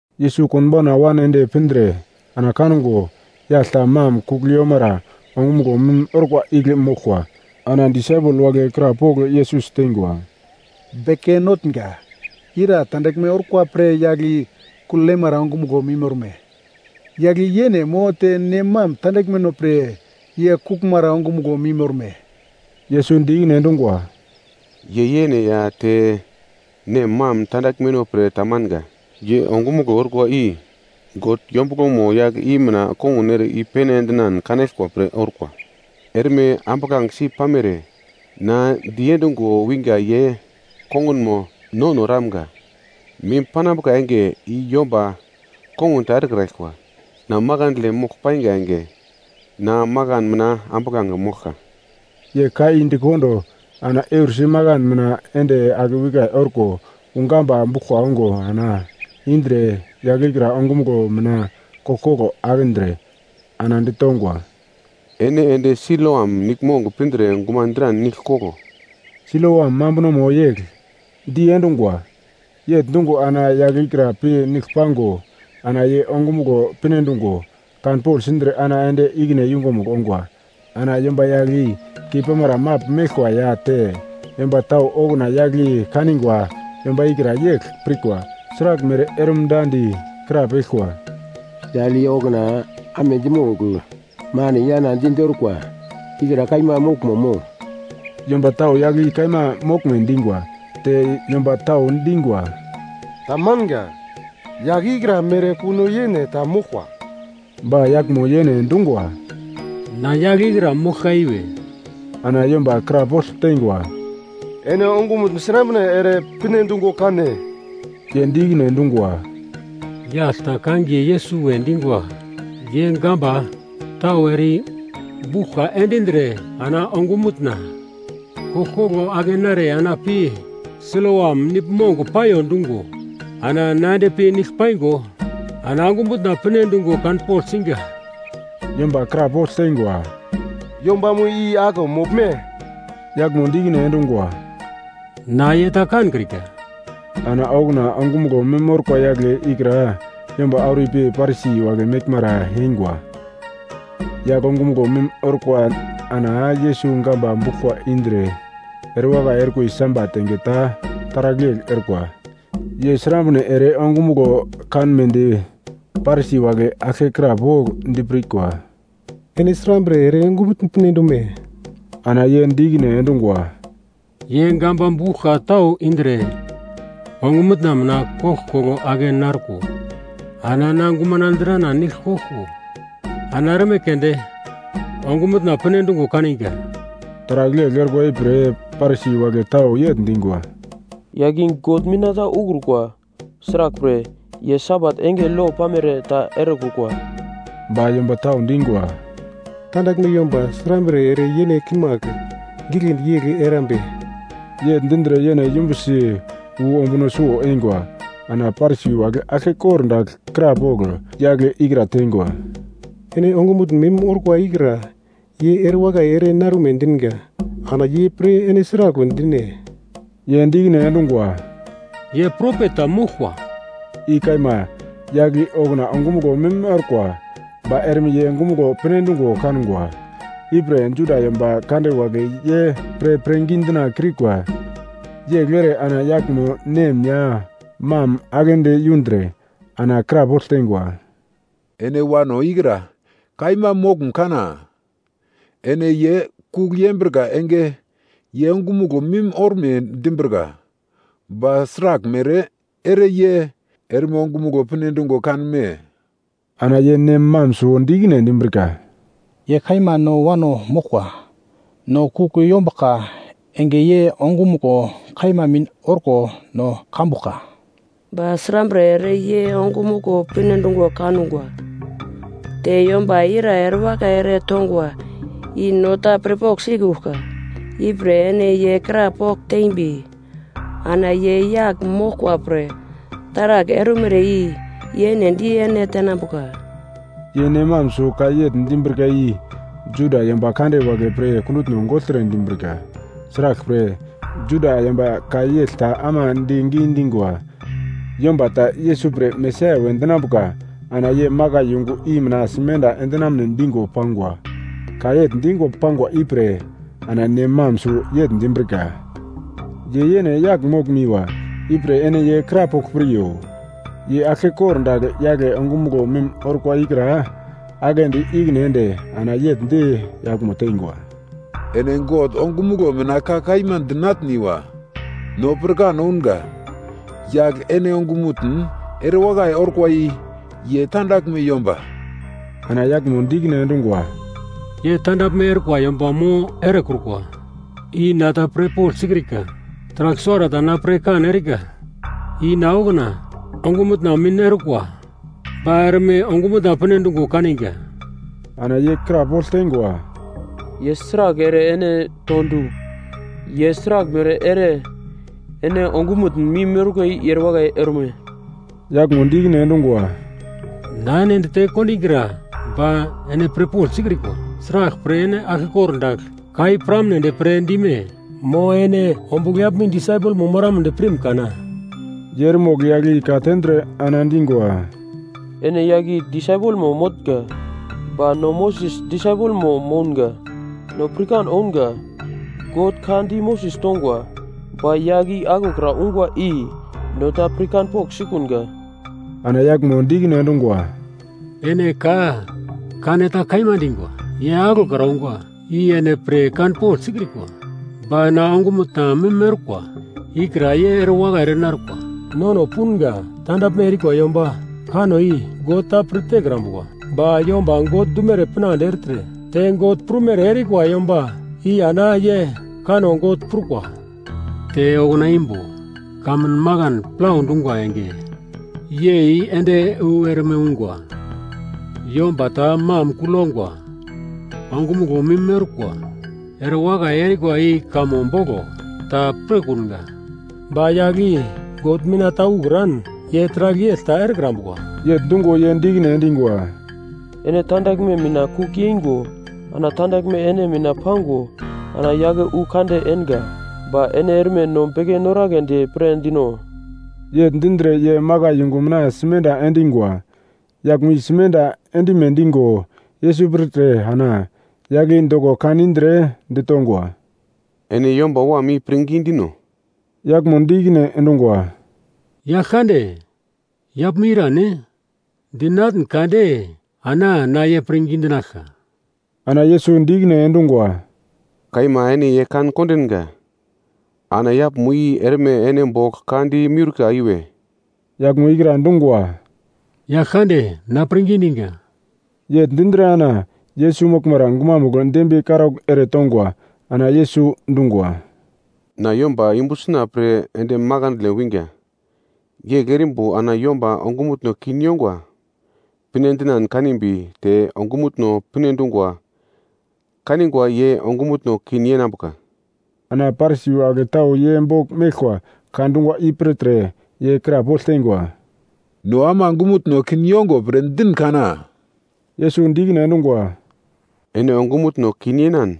Yesus konbauna wan ende pindre ana kango yagl ta mam kuglmara ongumuglo mim orkwa igle moglkwa. Ana disaipel wagle krapogl Yesus teingwa, “Beke Notnga, ira tandaglme orkwa pre yagl i kugl yemara ongumuglo mim orme? Yagl i yene mo te nem mam tandaglmeno pre ye kuglmara ongumuglo mim orme?” Yesus di ikine endungwa, “Ye yene ya te nem mam tandaglmeno pre tamanga. Ye ongumuglo orkwa i God yombuglomo yagl i mina kongun ere i-pene endinan kanaglkwa pre orkwa. Erme ambuglangesi pamere, na diendungo winga ye kongunmo nono eramga. Mim panambuka enge i yomba kongun ta erekraglkwa. Na makandle mogl painga enge, na makan mina ambuglange moglka.” Ye ka i di kondo ana eursi makan mina ende akewikai orko wu gamba buglkwa ongo ana indre yagl ikra ongumuglo mina koglkoglo akindre, ana ditongwa, “Ene ende Siloam Niglmong pindre guman dran nigl koglo.” Siloam mambunomo yegl, ‘Diendungwa.’ Yegl dungo ana yagl ikra pi nigl pango ana ye ongumuglo pinedungo kanpogl sindre ana ende ikine yungumugl ongwa. Ana yomba yagl i keipamara magl meglkwa ya te yomba tau okuna yagl i kanigwa yomba ikra yegl pirkwa, sraglmere orumda di krapeglkwa, “Yagl i okuna amedi mogl moni yana di-di orkwa ikra kaima moglmo, mo?” Yomba tau yagl i kaima moglme dingwa, te yomba tau dingwa, “Ta manga, yagl ikra mere kuno yene ta moglkwa.” Ba yaglmo yene dungwa, “Na yagl ikra moglka iwe.” Ana yomba krapogl teingwa, “Ene ongumutn srambre ere pinedungo kan-ne?” Ye di ikine endungwa, “Yagl ta kangiye Yesus we dingwa, ye gamba tau ere i buglkwa endindre ana ongumutna koglkoglo ake nare ana pi Siloam Niglmong paiyo dungo, ana na ende pi nigl paingo, ana ongumutna pinedungo kanpogl singa.” Yomba krapogl teingwa, “Yombamo i aglo moglme?” Yaglmo di ikine endungwa, “Na ye ta kankrika.” Ana okuna ongumuglo mim orkwa yagle ikra yomba auro ipi Parisi wagle meglmara eingwa. Yagl ongumuglo mim orko ana Yesus gamba buglkwa indre erewakai orkwa i Sabat enge ta taragl yegl orkwa. Ye srambre ere ongumuglo kanmedi Parisi wagle aglke krapogl dipirkwa, “Ene srambre ere ongumutn pinedume?” Ana ye di ikine endungwa, “Ye gamba buglkwa tau indre ongumutna mina koglkoglo ake narko ana na gumana drana nigl koglko ana erme keunde ongumutna pinedungo kaninga.” Taragl yegl orkwa ipre Parisi wagle tau yegl dingwa, “Yagl i God mina ta ukrukwa. Sraglpre ye Sabat enge lo pamere ta erekrukwa.” Ba yomba tau dingwa, “Tandaglme yomba srambre ere yene kimagl giglendi yegl erambe?” Yegl dindre yene yumbusi wu ombuno suwo eingwa. Ana Parisi wagle aglke kordagl krapogl yagle ikra teingwa, “Ene ongumutn mim orkwa ikra ye erewakai ere narume dinga. Ana ye pre ene sragl we dine?” Ye di ikine endungwa, “Ye propet ta moglkwa.” I kaima, yagl i okuna ongumuglo mim orkwa, ba erme ye ongumuglo pinedungo kangwa. Ipre Juda yomba kande wagle ye pre pirngi dina kiurikwa. Yegl ere ana yaglmo nem ya mam aglendi yundre, ana krapogl teingwa, “Ene wano ikra kaima moglum kana? Ene ye kugl yembrika enge ye ongumuglo mim orme dimbrika. Ba sraglmere ere ye erme ongumuglo pinedungo kanume?” Ana ye nem mam suwo di ikine endimbrika, “Ye kaima no wano moglkwa. No kugl yombuglka enge ye ongumuglo kaima mim orko no kambuglka. Ba srambre ere ye ongumuglo pinedungo kangwa, te yomba ira erewakai ere tongwa i no ta pirpogl sikuglka. Ipre ene ye krapogl tembi ana ye yagl moglkwa pre taragl ormere i yene di ene tenambuka.” Ye nem mam suwo ka yegl dimbrika i Juda yomba kande wagle pre kundutno gogltre dimbrika. Sraglpre, Juda yomba ka yegl ta ama di gidingwa, yomba ta Yesus pre Mesaia we dinambuka, ana ye makai yungu i mina simenda endinamne dingo pangwa. Ka yegl dingo pangwa ipre ana nem mam suwo yegl dimbrika, “Ye yene yagl moglumiwa, ipre ene ye krapogl piryo.” Ye aglke kordagl yagle ongumuglo mim orkwa ikra aglendi ikine ende ana yegl di yaglmo teingwa, “Ene God ongumuglo mina ka kaima dinatniwa! No pirkan ounga, yagl ene ongumutn erewakai orkwa i ye tandaglme yomba.” Ana yaglmo di ikine endungwa, “Ye tandaglme orkwa yomba mo erekrukwa i na ta pirpogl sikrika. Taragl suwarata na pirkan erika i na okuna ongumutna mim orkwa ba erme ongumutna pinedungo kaninga.” Ana ye krapogl teingwa, “Ye sragl ere ene to du? Ye sraglmere ere ene ongumutn mim orkwa i erewakai orme?” Yaglmo di ikine endungwa, “Na ene dite kondingra, ba ene pirpogl sikrikwa. Sraglpre ene aglke kordagl ka i piramnedi pre dime? Mo, ene ombugl yaglmo i disaipelmo moramnedi pirm kana?” Ye eremogl yagl i ka-tendre ana dingwa, “Ene yagle i disaipelmo motnga, ba no Moses disaipelmo mounga. No pirkan ounga God ka di Moses tongwa. Ba yagl i aglokra ungwa i no ta pirkanpogl sikunga.” Ana yaglmo di ikine endungwa, “Ene ka kaneta kaima dingwa! Ye aglokra ungwa i ene pirkan pogl sikrikwa, ba na ongumutna mim orkwa ikra ye erewakai ere narkwa. Nono punga tandaglme erikwa yomba kanno i God ta pir tekrambuka, ba yomba God dumere pinande ertre te God prumere erikwa yomba i ana ye kanno God prukwa. Te okuna imbo kamun makan plau dungwa enge yei ende wu erme ungwa, yomba ta mam kugl yongwa ongumuglo mim orkwa erewakai erikwa i kamo boglo ta pirkunga. Ba yagl i God mina ta ukran, ye taragl yegl ta erekrambuka.” Yegl dungo ye di ikine endingwa, “Ene tandaglme mina kugl yeingo ana tandaglme ene mina pango ana yake wu kande enga, ba ene erme no beke noragledi pre dino?” Yegl dindre ye makai yungu mina simenda endingwa. Yaglmo i simenda end-ime dingo Yesus pirtre ana yagle i doko kan indre, ditongwa, “Ene Yomba Wam i pirngi dino?” Yaglmo di ikine endungwa, “Yaglkande, yaglmo i irane? Dinatn kade ana na ye pirngi dinaglka.” Ana Yesus di ikine endungwa, “Kaima, ene ye kan kondinga, ana yaglmo i erme ene bogl ka di miurka iwe.” Yaglmo ikra dungwa, “Yaglkande, na pirngi diga.” Yegl dindre ana Yesus moglmara gumamugl dembiye karaugl ere tongwa. Ana Yesus dungwa, “Na yomba yumbu sina pre ende makandle winga, yegl erimbo ana yomba ongumutno kin yongwa pinedinan kanimbi te ongumutno pinedungo kanigwa ye ongumutno kin yenambuka.” Ana Parisi wagle tau ye bogl meglkwa ka dungwa i pirtre ye krapogl teingwa, “No ama ongumutno kin yongo pre din kana?” Yesus di ikine endungwa, “Ene ongumutno kin yenan,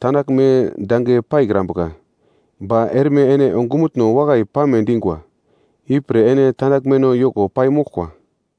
tandaglme dange paikrambuka, ba erme ene ongumutno wakai pame dingwa, ipre ene tandaglmeno yoko pai moglkwa.